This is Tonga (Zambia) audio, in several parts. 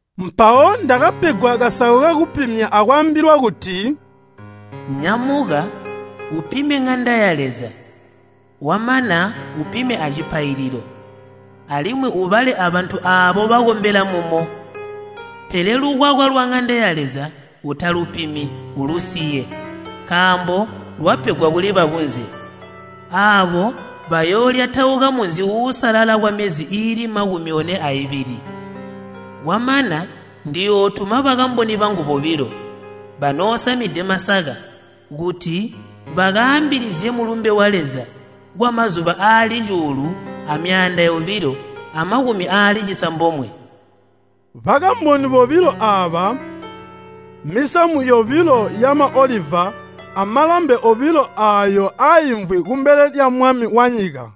Mpawo ndakapegwa kasako kakupimya akwaambilwa kuti, “Nyamuka upime ŋanda ya Leza wamana upime acipaililo, alimwi ubale abantu aabo bakombela mumo. Pele lukwakwa lwaŋanda ya Leza utalupimi ulusiye, nkaambo lwapegwa kuli bakunze. Aabo bayoolyatauka munzi uusalala kwamyezi iili makumi one aibili. Kwamana ndiyootuma bakamboni bangu bobilo, banoosamide masaka kuti bakaambilizye mulumbe wa Leza kwamazuba aali cuulu amyaanda yobilo amakumi aali cisambomwe.” Bakamboni bobilo aaba, mmisamu yobilo yamaoliva amalambe obilo aayo aaimvwi kumbele lya Mwami wanyika.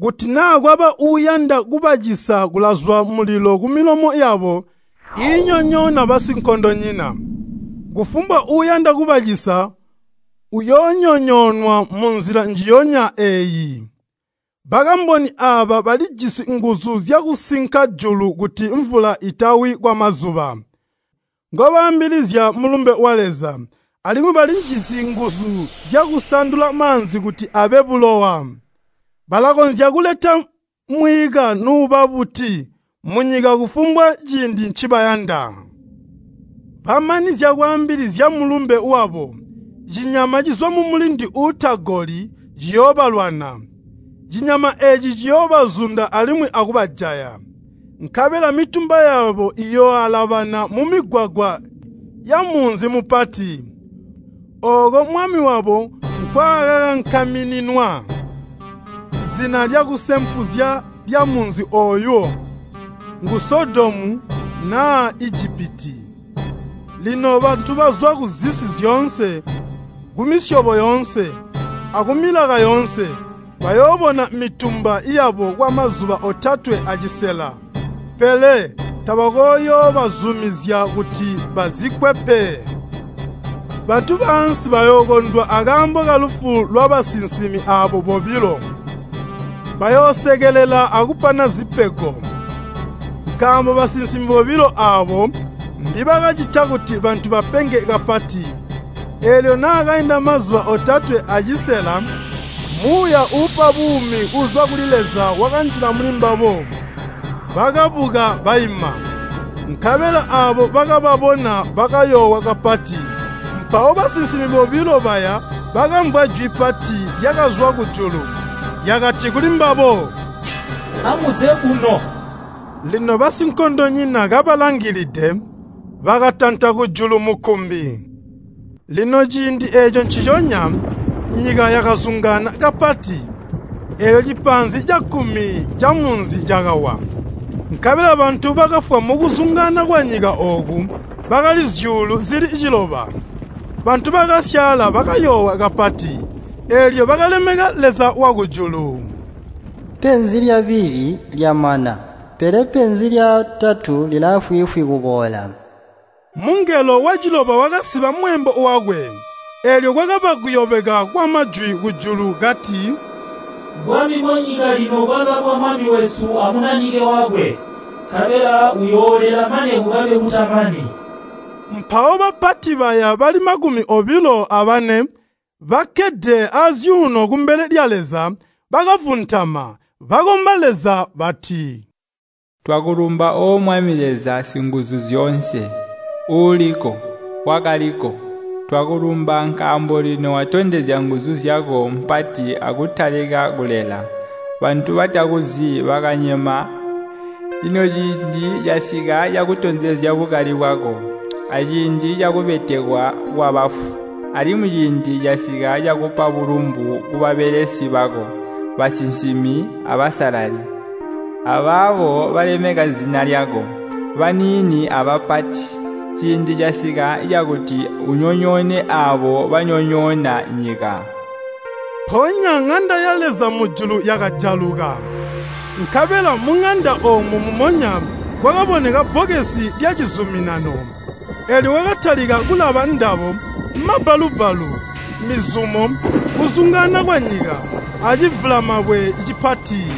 Kuti naa kwaba uuyanda kubacisa kulazwa mulilo kumilomo yabo iinyonyoona basinkondonyina. Kufumbwa uuyanda kubacisa uuyoonyonyoonwa munzila njiyonya eeyi. Bakamboni aaba balijisi nguzu zyakusinka julu kuti mvula itawi kwamazuba ngobaambilizya mulumbe wa Leza. Alimwi balijisi nguzu zyakusandula maanzi kuti abe bulowa. Balakonzya kuleta mwiika nuuba buti munyika kufumbwa ciindi ncibayanda. Bamanizya kwaambilizya mulumbe wabo, cinyama cizwa mumulindi uutagoli, ciyoobalwana. Cinyama eeci ciyoobazunda alimwi akubajaya. Nkabela mitumba yabo iyooalabana mumigwagwa yamunzi mupati, ooko Mwami wabo nkwaakakankamininwa. Zina lyakusempuzya lyamunzi ooyo ngu Sodomu naa Ijipiti. Lino bantu bazwa kuzisi zyoonse, kumisyobo yoonse, akumilaka yoonse, bayoobona mitumba yabo kwamazuba otatwe acisela, pele tabakooyoobazumizya kuti bazikkwe pe. Bantu baansi bayookondwa akaambo kalufu lwabasinsimi aabo bobilo. Bayoosekelela akupana zipego, nkaambo basinsimi bobilo aabo mbibakacita kuti bantu bapenge kapati. Eelyo naakainda mazuba otatwe acisela, muuya uupa buumi uuzwa kuli Leza wakanjila mulimbabo. Bakabuka baima, nkabela aabo bakababona bakayoowa kapati. Mpawo basinsimi bobilo baya bakamvwa jwi pati lyakazwa kujulu, lyakati kulimbabo, “Amuze kuno.” Lino basinkondonyina kabalangilide, bakatanta kujulu mukkumbi. Lino ciindi eeco nciconya, nyika yakazungaana kapati, eelyo cipaanzi cakkumi camunzi cakawa, nkabela bantu bakafwa mukuzungaana kwanyika ooku bakali zyuulu zili ciloba. Bantu bakasyaala bakayoowa kapati, eelyo bakalemeka Leza wakujulu. Penzi lyabili lyamana, pele penzi lyatatu lilaafwiifwi kuboola! Mungelo waciloba wakasiba mweembo wakwe, eelyo kwakaba kuyobeka kwamajwi kujulu kati, “Bwami bwanyika lino bwaba bwa Mwami wesu a Munanike wakwe, nkabela uyoolela mane kukabe kutamani!” Mpawo bapati baya bali makumi obilo abane bakkede azyuuno kumbele lya Leza, bakavuntama, bakomba Leza bati, “Twakulumba O Mwami Leza Singuzuzyoonse, Uuliko, Wakaliko. Twakulumba nkaambo lino watondezya nguzu zyako mpati akutalika kulela. Bantu batakuzi bakanyema, lino ciindi casika cakutondezya bukali bwako, aciindi cakubetekwa kwabafu. Alimwi ciindi casika cakupa bulumbu kubabelesi bako, basinsimi abasalali, abaabo balemeka zina lyako, baniini abapati. Ciindi casika cakuti unyonyoone aabo banyonyoona nyika.” Mpoonya ŋanda ya Leza mujulu yakajaluka, nkabela muŋanda oomo mumonya kwakaboneka Bbokesi lya Cizuminano. Eelyo kwakatalika kulaba ndabo, mabbalu-bbalu, mizumo, kuzungaana kwanyika, acivulamabwe cipati.